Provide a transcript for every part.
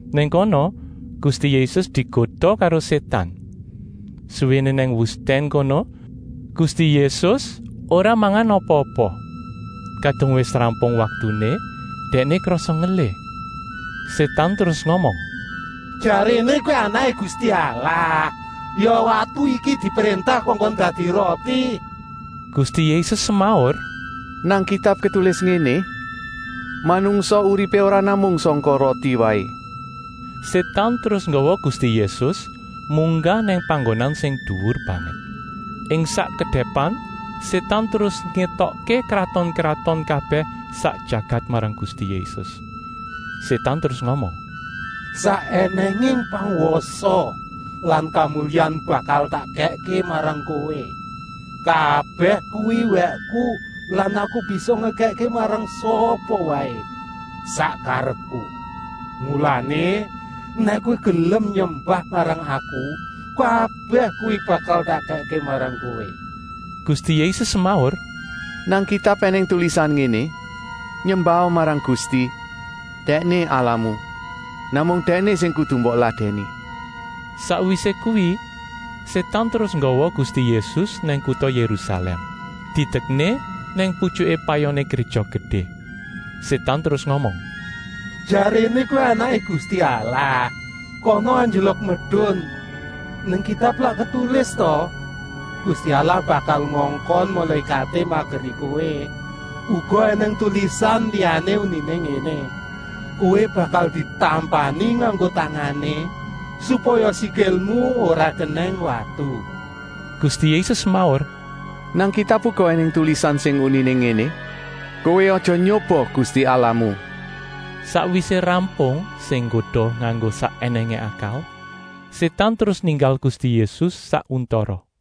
Nang kono Gusti Yésus digoda karo Sétan. Suwéné nang wustèn kono Gusti Yésus ora mangan apa-apa. Kadung wis rampung waktuné Dèkné krasa ngelih. Sétan terus ngomong: “Jaréné Kowé Anaké Gusti Allah, ya watu iki dipréntah kongkon dadi roti!” Gusti Yésus semaur: “Nang Kitab ketulis ngéné: ‘Manungsa uripé ora namung sangka roti waé.’” Sétan terus nggawa Gusti Yésus munggah nang panggonan sing duwur banget. Ing sak kedèpan Sétan terus ngétokké kraton-kraton kabèh sak jagat marang Gusti Yésus. Sétan terus ngomong: “Sak ènèngé pangwasa lan kamulyan bakal tak kèkké marang Kowé. Kabèh kuwi wèkku lan aku bisa ngekèkké marang sapa waé sak karepku. Mulané, nèk Kowé gelem nyembah marang aku, kabèh kuwi bakal tak kèkké marang Kowé.” Gusti Yésus semaur: “Nang Kitab ènèng tulisan ngéné: ‘Nyembaha marang Gusti, Dèkné Allahmu. Namung Dèkné sing kudu mbok ladèni.’” Sakwisé kuwi Sétan terus nggawa Gusti Yésus nang kuta Yérusalèm, didekné nang putyuké payoné Gréja Gedé. Sétan terus ngomong: “Jaréné Kowé Anaké Gusti Allah, kana anjlok medun. Nang Kitab lak ketulis ta: ‘Gusti Allah bakal ngongkon mulékaté mageri kowé.’ Uga ènèng tulisan liyané uniné ngéné: ‘Kowé bakal ditampani nganggo tangané, supaya sikilmu ora kenèng watu.’” Gusti Yésus semaur: “Nang Kitab uga ènèng tulisan sing uniné ngéné: ‘Kowé aja nyoba Gusti Allahmu!’” Sakwisé rampung sing nggoda nganggo sak ènèngé akal, Sétan terus ninggal Gusti Yésus sak untara.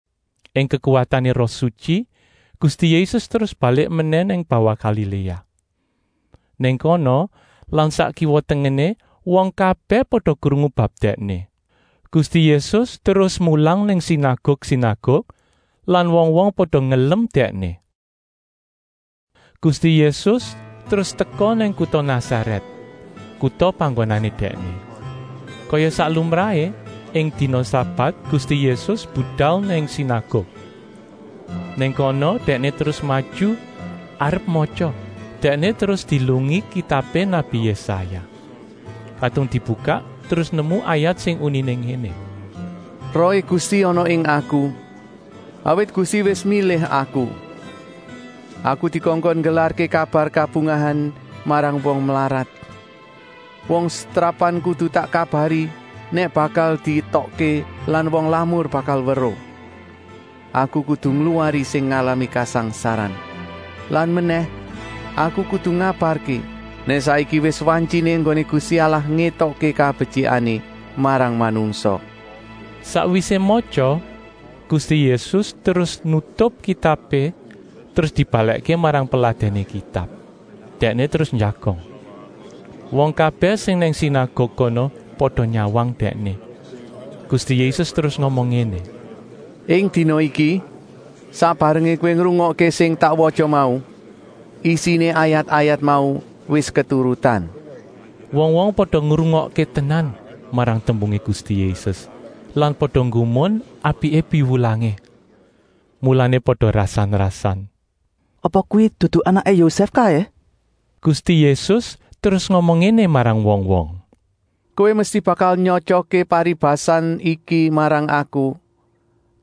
Ing kekuwatané Roh Sutyi Gusti Yésus terus balik menèh nang bawah Galiléa. Nang kono lan sak kiwa-tengené wong kabèh pada krungu bab Dèkné. Gusti Yésus terus mulang nang sinaguk-sinaguk lan wong-wong pada ngelem Dèkné. Gusti Yésus terus teka nang kuta Nasarèt, kuta panggonané Dèkné. Kaya sak lumrahé, ing dina sabat Gusti Yésus budal nang sinaguk. Nang kono Dèkné terus maju arep matya. Dèkné terus dielungi kitabé nabi Yésaya. Kadung dibukak terus nemu ayat sing uniné ngéné: “Rohé Gusti ana ing Aku, awit Gusti wis milih Aku. Aku dikongkon nggelarké kabar kabungahan marang wong mlarat. Wong setrapan kudu tak kabari nèk bakal dietokké lan wong lamur bakal weruh. Aku kudu ngluwari sing ngalami kasangsaran. Lan menèh, aku kudu ngabarké nèk saiki wis wantyiné enggoné Gusti Allah ngétokké kabetyikané marang manungsa.” Sakwisé matya, Gusti Yésus terus nutup kitabé terus dibalèkké marang peladèné Kitab. Dèkné terus njagong. Wong kabèh sing nang sinaguk kono pada nyawang Dèkné. Gusti Yésus terus ngomong ngéné: “Ing dina iki, sak barengé kowé ngrungokké sing tak watya mau, isiné ayat-ayat mau wis keturutan.” Wong-wong pada ngrungokké tenan marang tembungé Gusti Yésus lan pada nggumun apiké piwulangé. Mulané pada rasan-rasan: “Apa kuwi dudu anaké Yosèf kaé?” Gusti Yésus terus ngomong ngéné marang wong-wong: “Kowé mesti bakal nyotyokké paribasan iki marang aku: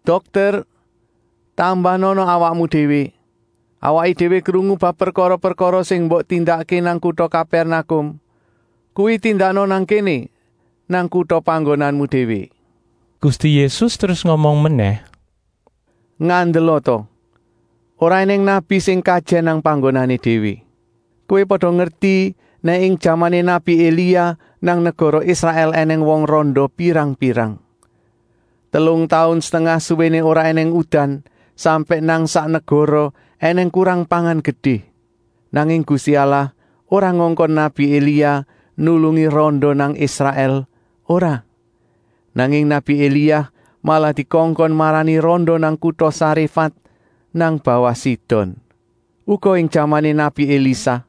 ‘Dokter, tambanana awakmu déwé! Awaké déwé krungu bab prekara-prekara sing mbok tindakké nang kuta Kapèrnakum, kuwi tindakna nang kéné, nang kuta panggonanmu déwé.’” Gusti Yésus terus ngomong menèh: “Ngandela ta, ora ènèng nabi sing kajèn nang panggonané déwé. Kowé pada ngerti nèk ing jamané nabi Elia nang negara Israèl ènèng wong randa pirang-pirang. Telung taun setengah suwéné ora ènèng udan, sampèk nang sak negara ènèng kurang pangan gedé. Nanging Gusti Allah ora ngongkon nabi Elia nulungi randa nang Israèl, ora. Nanging nabi Elia malah dikongkon marani randa nang kuta Saréfat nang bawah Sidon. Uga ing jamané nabi Elisa,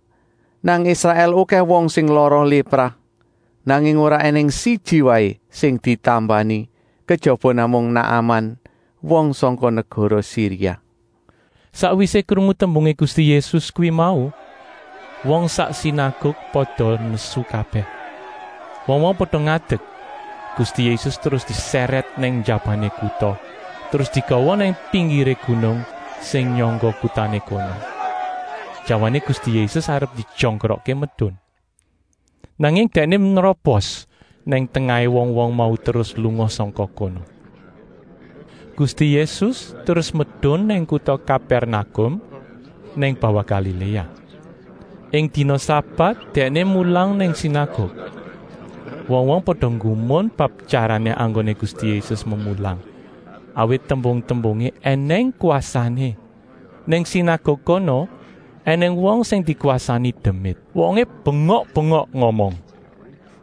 nang Israèl okèh wong sing lara lépra. Nanging ora ènèng siji waé sing ditambani, kejaba namung Naaman, wong sangka negara Siria.” Sakwisé krungu tembungé Gusti Yésus kuwi mau wong sak sinaguk pada nesu kabèh. Wong-wong pada ngadek, Gusti Yésus terus disèrèt nang njabané kuta, terus digawa nang pinggiré gunung sing nyangga kutané kono. Jawané Gusti Yésus arep dijongkrokké medun. Nanging Dèkné nrobos nang tengahé wong-wong mau terus lunga sangka kono. Gusti Yésus terus medun nang kuta Kapèrnakum nang bawah Galiléa. Ing dina sabat Dèkné mulang nang sinaguk. Wong-wong pada nggumun bab tyarané enggoné Gusti Yésus memulang, awit tembung-tembungé ènèng kwasané. Nang sinaguk kono ènèng wong sing dikwasani demit. Wongé bengok-bengok ngomong: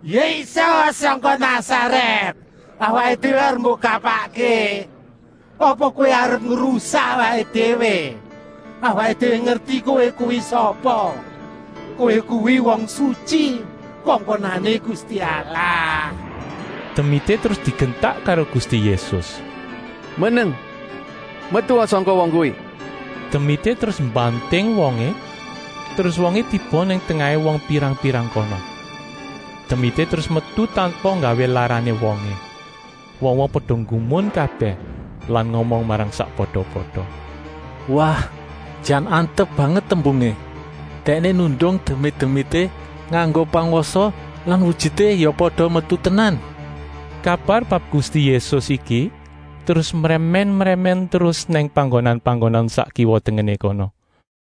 “Yésus sangka Nasarèt, awaké déwé arep mbok kapakké? Apa Kowé arep ngrusak awaké déwé? Awaké déwé ngerti Kowé kuwi sapa! Kowé kuwi Wong Sutyi, kongkonané Gusti Allah!” Demité terus digentak karo Gusti Yésus: “Meneng! Metua sangka wong kuwi!” Demité terus mbanting wongé, terus wongé tiba nang tengahé wong pirang-pirang kono. Demité terus metu tanpa nggawé larané wongé. Wong-wong pada nggumun kabèh lan ngomong marang sakpada-pada: “Wah, jan antep banget tembungé. Dèkné nundung demit-demité nganggo pangwasa lan wujuté ya pada metu tenan.” Kabar bab Gusti Yésus iki terus mrèmèn-mrèmèn terus nang panggonan-panggonan sak kiwa-tengené kono.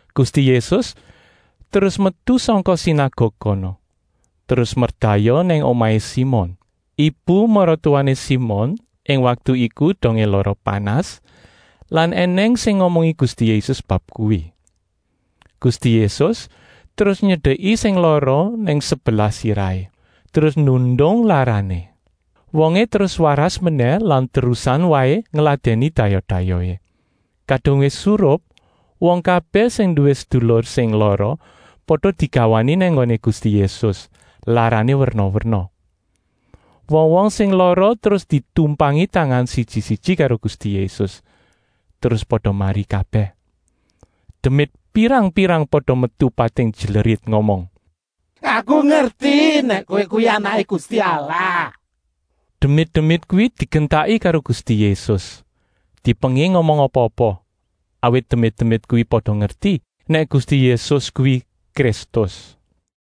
Gusti Yésus terus metu sangka sinaguk kono, terus merdayoh nang omahé Simon. Ibu-maratuwané Simon ing waktu iku dongé lara panas lan ènèng sing ngomongi Gusti Yésus bab kuwi. Gusti Yésus terus nyedeki sing lara nang sebelah sirahé, terus nundung larané. Wongé terus waras menèh lan terusan waé ngladèni dayoh-dayohé. Kadung wis surup, wong kabèh sing nduwé sedulur sing lara pada digawani nang nggoné Gusti Yésus, larané werna-werna. Wong-wong sing lara terus ditumpangi tangan siji-siji karo Gusti Yésus, terus pada mari kabèh. Demit pirang-pirang pada metu pating jlerit, ngomong: “Aku ngerti nèk Kowé kuwi Anaké Gusti Allah.” Demit-demit kuwi digentaki karo Gusti Yésus, dipenging ngomong apa-apa, awit demit-demit kuwi pada ngerti nèk Gusti Yésus kuwi Kristus.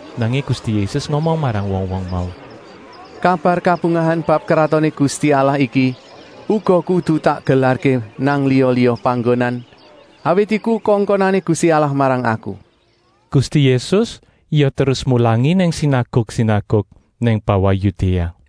Nanging Gusti Yésus ngomong marang wong-wong mau: “Kabar kabungahan bab Kratoné Gusti Allah iki uga kudu tak gelarké nang liya-liya panggonan, awit iku kongkonané Gusti Allah marang Aku.” Gusti Yésus ya terus mulangi nang sinaguk-sinaguk nang bawah Yudéa.